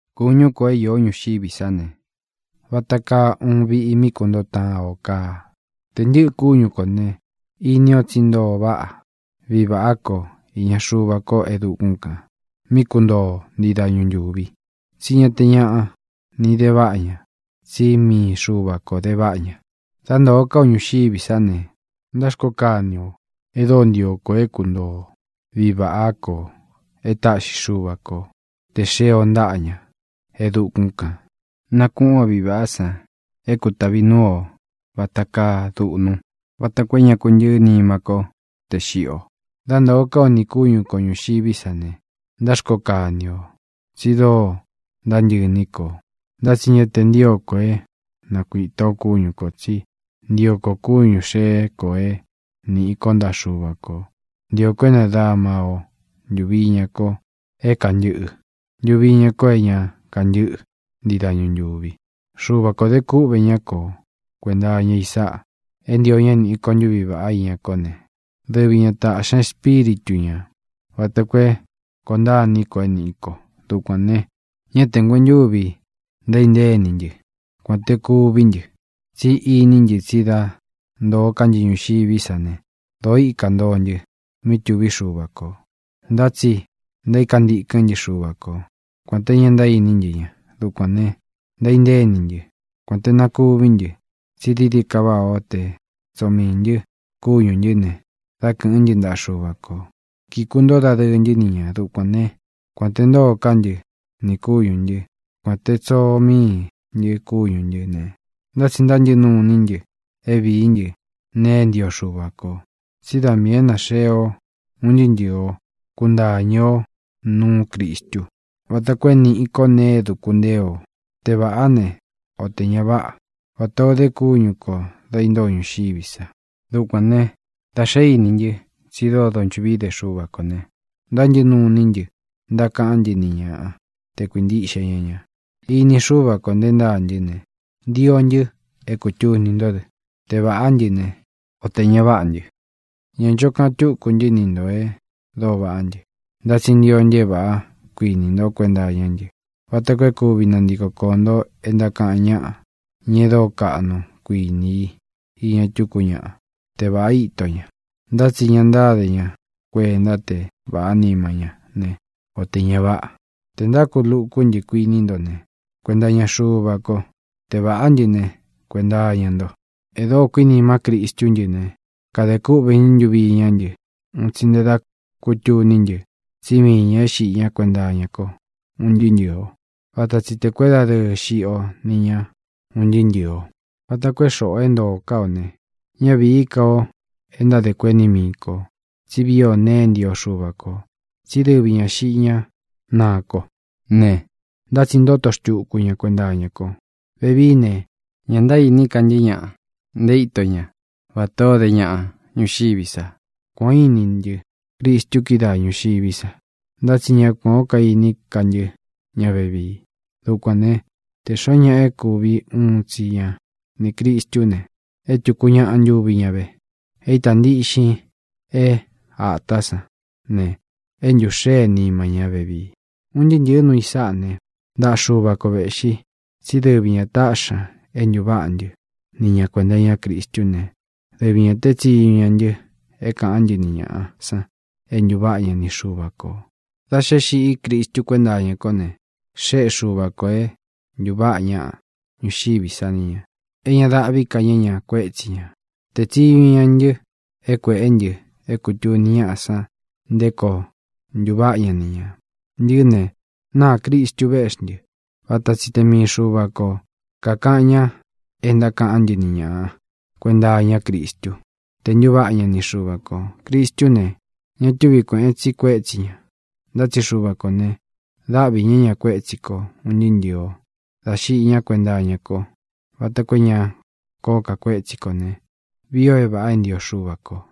Kūñú kō é īó ñuxiví sa ne, vata kaa uun viꞌi mí kuntoo taan ō kaa. Tē ntɨ́ꞌɨ kúñu kō ne, ini o tsí ntoo váꞌa viꞌi vāꞌá ko īña Xuva ko e dukún kān, mí kuntoo o ntii dañu ntūvi. Tsí ña te ñaꞌa ni de váꞌa ña, tsí mii Xuva kō de váꞌa ña. Dá ntōo ká o ñuxiví sa ne, ntáxkoo kani ō e dóo ntio ko é kuntoo o viꞌi vāꞌá kō é taꞌxi Xuva ko tē xeé o ntaꞌa ña e dukún kān. Nakūꞌún o viꞌi vāꞌá san é kūtavi núu o vata kaa duꞌnu vata koo é ña kuntɨɨ́ nima ko te xiꞌi o. Dá ntōo ká o nī kúñu kō ñuxiví sa ne, ntáxkoo kani ō tsi dóo ntántɨꞌɨ iní kō. Ntá tsi ña te ntío kō é nakuīta o kúñu kō, tsí ntio ko kúñū xeé kō é nīꞌi ko ntaꞌa Xúva kō. Ntio kō é nadama o ntūvi iña ko é kantɨꞌɨ ntuvi iña ko é ña kantɨ́ꞌɨ ntii dañu ntūvi. Xuva kō de kúꞌvē ñá ko kuēnta iña i sáꞌa: é ntio ñā é nīꞌi ko ntuví vaꞌá iña kó ne, dɨvi ñā táꞌxi ña Espíritu ñā vata koo é koo ntaá ini ko é nīꞌi ko. Dukuān ne, ñá tē nguentuvi ntaíntée ini ntɨ, kuān té kuví ntɨ, tsí iní ntɨ tsi dá ntōo ká ntɨ ñuxiví sa ne, dōó ikā ntoo ntɨ mí tuví Xuva kō. Ntá tsi ntaíka ntikɨ́n ntɨ Xuva ko, kuān te ña ntaíní ntɨ ña. Dukuān ne, ntaíntée ini ntɨ, kuān te na kuví ntɨ, tsi dií dií ka váꞌā ó te tsoo miī ntɨ kúñū ntɨ́ ne, dá kɨ̄ꞌɨ́n ntɨ ntaꞌa Xuva kō, kíkuntóo dadɨɨ ntɨ́ ni ñā. Dukuān né, kuān te ntóo ká ntɨ nī kúñū ntɨ́, kuān te tsoo míi ntɨ kúñū ntɨ́ ne, ntá tsi ntántɨꞌɨ nuu iní ntɨ é vīí ntɨ nēe é ntio Xuva kō. Tsí da miī é naxee o un ntɨɨ́ ntɨɨ o kuntāñɨ ó nuú Cristu vata koo é nīꞌi ko nee é dūku ntée o, te vāꞌá ne, o tē ña váꞌa, vatā o de kúñu kō da intóo o ñuxiví sa. Dukuān ne, da xé iní ntɨ tsi dóo donchuꞌví ide Xuva kō ne, ntántɨꞌɨ nuu iní ntɨ ntákaꞌán ntɨ ni ñaꞌa te kuīntiꞌxe ña ña. Ini Xúva kō nté ntaa ntɨ́ ne, ntio ntɨ é kūtuni ntó dɨ, te vāꞌá ntɨ ne, o tē ña váꞌa ntɨ. Ñā ncho kaꞌan túkū ntɨ́ ni ntō e dóo vaꞌá ntɨ, ntá tsi ntio ntɨ é vāꞌá kuini nto kuenta iñá ntɨ vata koo é kuvi nantiko koō nto e ntákaꞌan ñáꞌa, ña e dóo kaꞌnu kuiní i iña tuku ñaꞌa te vāꞌa íto ña, ntá tsi ña ntáde ña kuenta te vāꞌá nima ñá ne, o tē ña váꞌa. Tē ntákulukú ntɨ, kuiní nto ne, kuenta iña Xuva ko; te vāꞌá ntɨ ne, kuenta iña nto. E dóo kuínima Cristú ntɨ ne, kade kúꞌvē ña ntuvi iñá ntɨ un tsi nte da kútuní ntɨ tsí mii ñā é xiꞌi ñá kuenta iña ko un ntɨɨ́ ntɨɨ̄ o. Vata tsi tē kuédadɨɨ xiꞌi o ni ña un ntɨɨ́ ntɨɨ̄ o, vata koo é xoꞌō é ntoo ká ō ne, ñá vīí ka ō é ntáde kueni mii ko, tsí vii o nee é ntio Xuva kō, tsí dɨvi ñā xiꞌi ñá naa ko ne, ntá tsi ntoto xtuku ña kuenta iña ko. Vevií ne, ña ntaíní ka ntɨ́ ñaꞌa nté ito ña vatā o dé ñaꞌa ñuxiví sa. Kuān o íni ntɨ́ Cristu kídaa ñūxiví sa, ntá tsi ña kuán o kaíní ka ntɨ́ ña vevii. Dukuān né, te xōo ñáꞌa é kuvi uun tsi ña nī Cristú ne, é tūku ñáꞌa ntuvi ña ve. É itā ntíꞌxin é ātá san ne, é ntūxée nima ñá vevii. Un ntɨɨ́ ntɨ̄ɨ́ nuu i sáꞌā né, ntaꞌa Xuva ko vēꞌxi, tsí dɨvi ñā táꞌxi ña é ntūváꞌa ntɨ́ ni ña kuēnta iñá Cristú ne, dɨvi ñā tée tsiñu ña ntɨ é kāꞌán ntɨ ni ñāꞌa san é ntūváꞌa ña ni Xuva kō. Da xe é xiꞌí Cristu kuénta iña kó ne, xéꞌe Xuva kō é ntūváꞌa ñaꞌa ñuxiví sa ni ñā, é ña dáꞌvī ká ña ña kuétsi ñā. Tēe tsiñu ña ntɨ é kuēꞌé ntɨ é kūtuni ñáꞌa san nté koo ntuváꞌa ña ni ñā. Ntɨꞌɨ́ ne, náā Cristu véꞌxi ntɨ. Vata tsi te mii Xuva ko kākaꞌan ña é ntákaꞌán ntɨ ni ñāꞌa kuenta iñá Cristú tē ntuváꞌa ña ni Xuva kō. Cristú ne, ña túvi kuēꞌen tsi kuétsi ñā. Ntá tsi Xuva kō ne, dáꞌvi ña ña kuētsí ko ūn ntɨɨ́ ntɨ̄ɨ o dá xiꞌi ñá kuenta iña ko vata koo é ña kōó ka kuétsi kō ne, vii ō é vāꞌa é ntio Xuva kō.